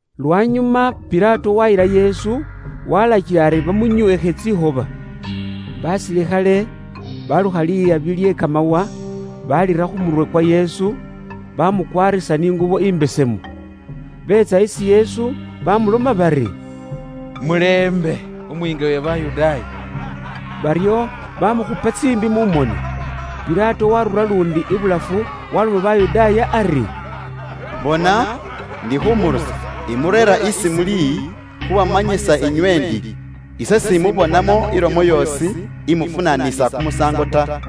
Lwanyuma Pilato waayila Yesu, waalakila ari bamunyweekhe tsikhoba. Basilikhale baalukha lihabi kye kamawa, baalira khu murwe kwa Yesu, baamukwaarisa ni ingubo imbesemu. Beetsa isi Yesu baamuloma bari, “Mulembe, Umuyiinga uwe Bayudaaya!” Baryo baamukhupa tsiimbi mu moni. Pilato waarura luundi ibulafu waaloma Bayudaaya ari, “Bona, ndi khuumurusa, imureera isi muli khuubamanyisa inywe ndi ise s'imubonamo ilomo yoosi, imufunanisa kumusaango ta.”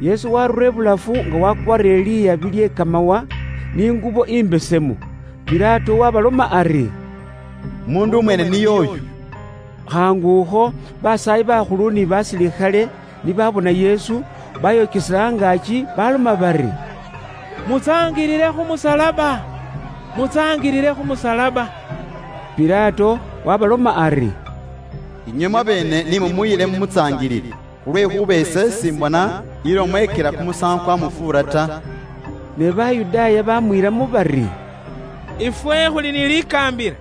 Yesu waarura ibulafu nga wakwaarire lihabi lye kamawa, ni ngubo imbesemu. Pilato waabaloma ari, “Umuundu mwene niye uyu.” Khaangukho Basaayi bakhulu ni basilikhale ni baabona Yesu, baayokesela angaaki, baaloma bari, “Mutsaangilile khu musalaba! Mutsaangilile khu musalaba!” Pilato waabaloma ari, “Inywe mwabeene ni mumuyile mumutsaangilile, khulwekhuuba ise s'imbona ilomo, ikila kumusaango kwamufuura ta.” Ne Bayudaaya baamwiilamo bari, “Ifwe khuli ni likaambila,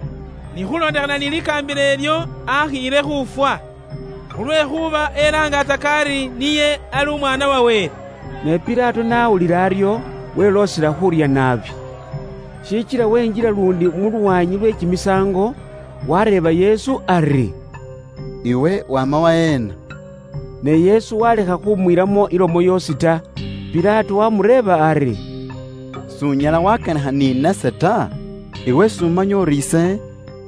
ni khuulondekhana ni likaambila ilyo, akhiile khuufwa! Khulwekhuuba elaangaatsaka ari niye ali Umwaana wa Wele.” Ne Pilato n'awulila aryo, weloosela khuurya naabi. Shikila wenjila luundi mu lwaanyi lwe kimisaango, wareeba Yesu ari, “Iwe waama waheena?” Ne Yesu waalekha khumwiilamo ilomo yoosi ta. Pilato waamureeba ari, “S'unyala waakanikha ni nase ta? Iwe s'umanya uri ise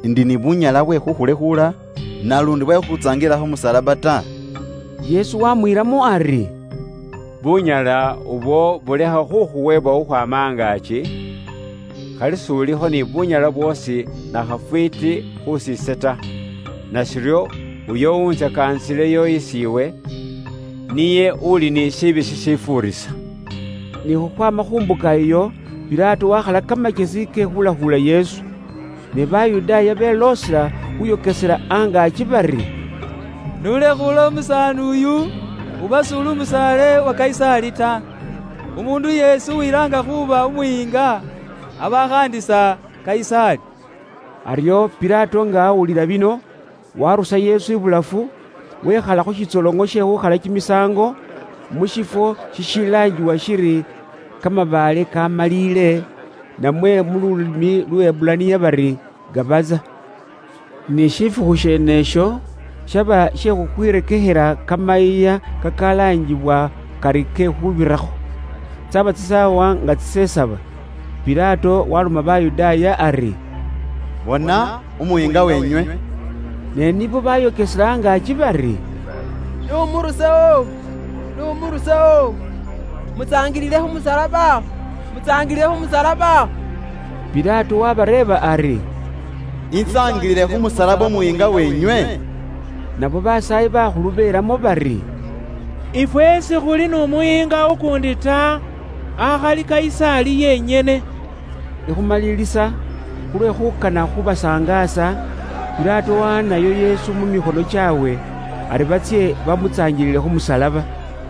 ndi ni bunyala bwe khuukhulekhuula, namwe bwe khuukhutsaangilila khu musalaba ta?” Yesu waamwiilamo ari, “Bunyala ubwo bulekha khukhuweebwa khukhwaama angaaki, khali s'ulikho ni bunyala bwoosi nakhafwiiti khus'ise ta. Nashiryo uyo uwuntsakaanisileyo isi iwe, niye uuli ni shishoonako shishifuurisa.” Ni khukhwaama khu mbuka iyo, Pilato waakhala kamakyesi ke khuulekhuula Yesu. Ne Bayudaaya beloosela khuuyokesela angaaki bari, “Iwe n'ulekhuula umusaani uyu, uba s'uli umusaale wa Kayisaali ta. Umuundu yeesi uwilaanga khuuba umuyiinga, aba akhaandisa Kayisaali.” Aryo Pilato nga awulila bino, waarusa Yesu ibulafu, wekhala khu shitsoloŋo she khuukhalilakho kimisaango, mu shifwo shishilaangibwa shiri “Kamabaale kamaalile,” namwe mu lulimi Luheburaniya bari, “Gabaza.” Ni shifukhu sheene isho, shaba she khukhwirekekhela Kamayiiya kakalaangibwa kari ke Khuubirakho. Tsyaba tsisaawa nga tsisesaba. Pilato waloma Bayudaaya ari, “Bona umuyiinga weenywe.” Ne nibo baayokesela angaaki bari, “N'umurusewo! N'umurusewo! Mutsaangilile khu musalaba! Mutsaangilile khu musalaba!” Pilato waabareeba ari, “Intsaangilile khu musalaba umuyiinga weenywe?” Nabo basaayi bakhulu belamo bari, “Ifwe sikhuli n'umuyiinga ukuundi ta, akhali Kayisaali yenyene.” Ikhumalilisa, khulwe khuukana khuubasangaasa, Pilato waawaanayo Yesu mu mikhono kyaabwe, ari batsye bamutsaangilile khu musalaba.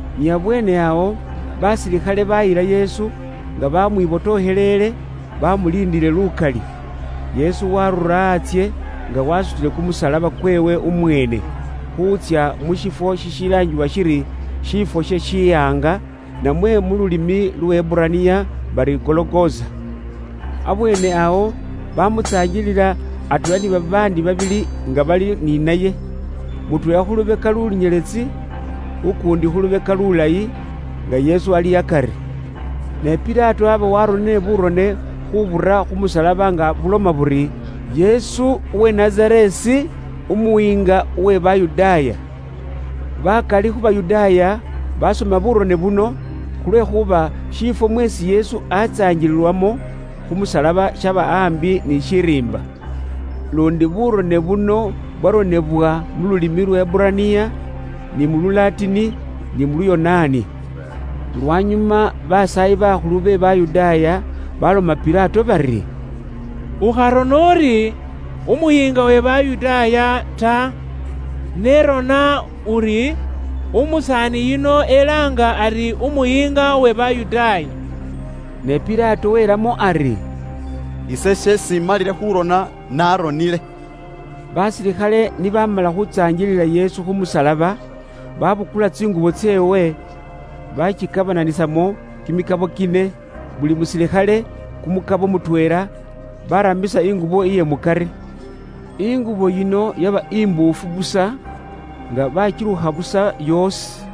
Ni abweene awo, basilikhale baayila Yesu, nga baamwibotokhelele, baamuliindile lukali. Yesu waarura antsye nga waasutile kumusalaba kweewe umweene, khuutsya mu shifwo shishilaangibwa shiri “Shiifwo she shihaanga,” namwe mu lulimi Luheburaniya bari “Gologosa.” Abweene awo, baamutsaangilila, atweela ni babaandi babili nga bali ni naye. Mutweela khu lubeka lunyeletsi, ukuundi khu lubeka lulayi, nga Yesu ali akari. Ne Pilato aaba waaronile buurone khuubura khu musalaba nga buloma buri, “Yesu uwe Nazareesi, Umuyiinga uwe Bayudaaya.” Bakali khu Bayudaaya baasoma buurone buno, khulwekhuuba shifwo mweesi Yesu aatsaangililwamo khu musalaba shaba aambi ni shiriimba. Luundi buurone buno bwaronebwa mu lulimi Luheburaniya, ni mu Lulatini, ni mu Luyonaani. Lwanyuma Basaayi bakhulu be Bayudaaya baloma Pilato bari, “Ukharona uri ‘Umuyiinga uwe Bayudaaya’ ta, ne rona uli ‘Umusaani yuno elaanga ari umuyiinga uwe Bayudaaya.’” Ne Pilato welamo ari, “Ise sheesi imalile khuurona, naaronile.” Basilikhale ni baamala khuutsaangilila Yesu khu musalaba, baabukula tsingubo tseewe, baatsikabananisamo kimikabo kine, buli musilikhale kumukabo mutweela, baaramisa ingubo iye mukari. Ingubo yino yaba imbuufu busa, nga baakilukha busa yoosi.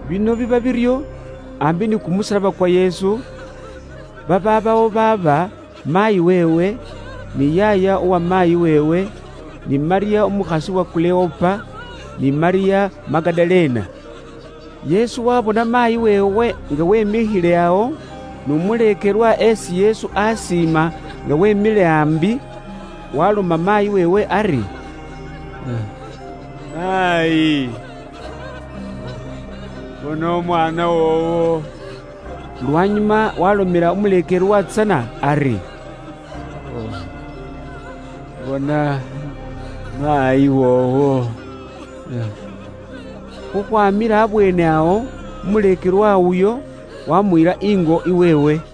Bino biba biryo, aambi ni kumusalaba kwa Yesu, babaabawo baaba, maayi weewe, ni yaaya uwa maayi weewe, ni Malyamu umukhasi uwa Kuleopa, ni Malyamu Magadalena. Yesu n'abona maayi weewe, atweela n'umuleekelwa abe isi niye akana naabi nga beemikhile awo, kila alomela maayi weewe ari, “Maayi, bona umwaana woowo.” Lwanyuma waalomela umuleekelwa tsana ari, “Bona maayi woowo.” Khukhwamila abweene awo, umuleekelwa uyo wamuyila ingo iweewe.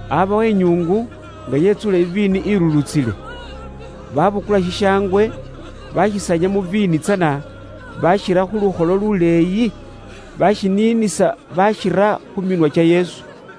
Aabawo inyuungu nga yetsuule iviini ilulutsile. Baabukula shishangwe, bashisanya mu viini tsana, bashira khu lukholo luleeyi, bashiniinisa bashira khu minwa kya Yesu.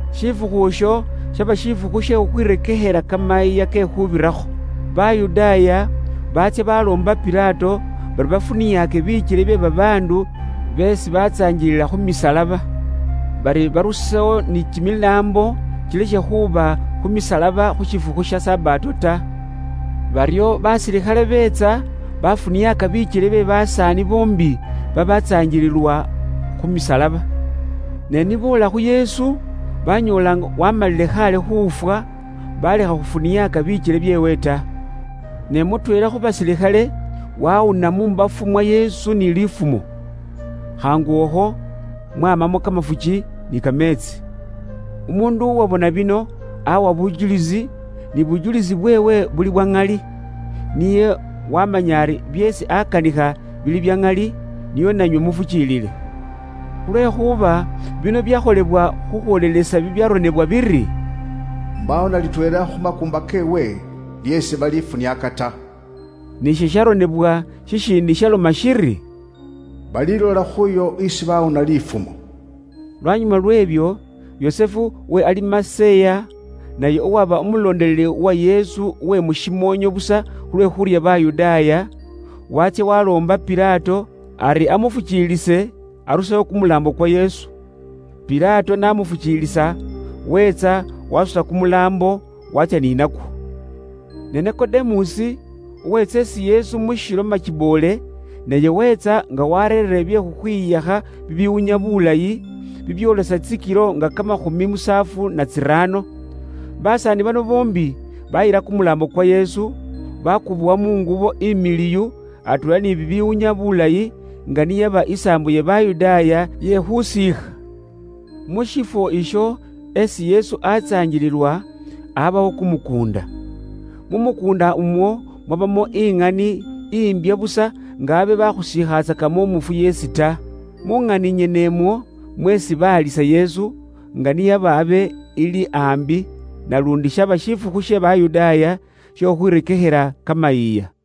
Shifukhu isho shaba shifukhu she khukhwirekekhela Kamayiiya ke Khuubirakho. Bayudaaya baatsya baloomba Pilato bari bafuniake bikyele bye babaandu beesi batsaangilila khu misalaba. Bari barusewo ni kimilaambo, kilekhe khuba khu misalaba khu shifukhu sha Sabato ta. Baryo basilikhale beetsa baafuniaaka bikyele bye basaani boombi baabatsaangililwa khu misalaba. Ne ni boola khu Yesu, banyoola nga waamalile khaale khuufwa, balekha khufuniaaka bikyele byeewe ta. Ne mutweela khu basilikhale wawuna mu mbafu mwa Yesu ni liifumo. Khaangu akho, mwamamo kamafuki ni kameetsi. Umuundu uwabona bino awa bujulisi, ni bujulisi bweewe buli bwa ŋali. Niye wamanya ari byeesi akanikha bili bya ŋali, nio nanywe mufukiilile. Khulwekhuuba bino byakholebwa khukhwoolelesa bibyaronebwa bikhosefu biri, “Mbaawo na litweela khu makuumba keewe lyeesi balifuniaaka ta.” Ni bibyaronebwa bikhosefu bibiiindi byaloma biri, “Balilola khuuyo esi baawuna lifumo.” Lwanyuma lweebyo, Yusufu uwe Alimaseya, naye uwaba umuleekelwa uwa Yesu uwe mushimoonyo busa khulwe khuurya Bayudaaya, waatsya waloomba Pilato ari amufukiilise arusewo kumulaambo kwa Yesu. Pilato n'amufuukiilisa, weetsa wasuta kumulaambo, waatsya ni nakwo. Ne Nikodemusi, uweetsa isi Yesu mu shilo makiboole, naye weetsa, nga wareerere bye khukhwihakha bibiwunya bulayi, bibyoolesa tsikilo nga kamakhumi musaafu na tsiraano. Basaani bano boombi bayila kumulaambo kwa Yesu, bakubowa mu ngubo imiliwu atweela ni bibiwunya bulayi, nga ni yaba isaambo iye Bayudaaya iye khuusiikha. Mu shifwo isho esi Yesu aatsaangililwa aabawo kumukuunda. Mu mukuunda umwo mwabamo iŋani imbya busa, nga abe baakhusiikhatsakamo umufu yeesi ta. Mu ŋani yeneeyo nimwo mweesi baalisa Yesu, nga ni yaba abe ili aambi, naluundi shaba shifukhu she Bayudaaya she khukhwirekekhela Kamayiiya.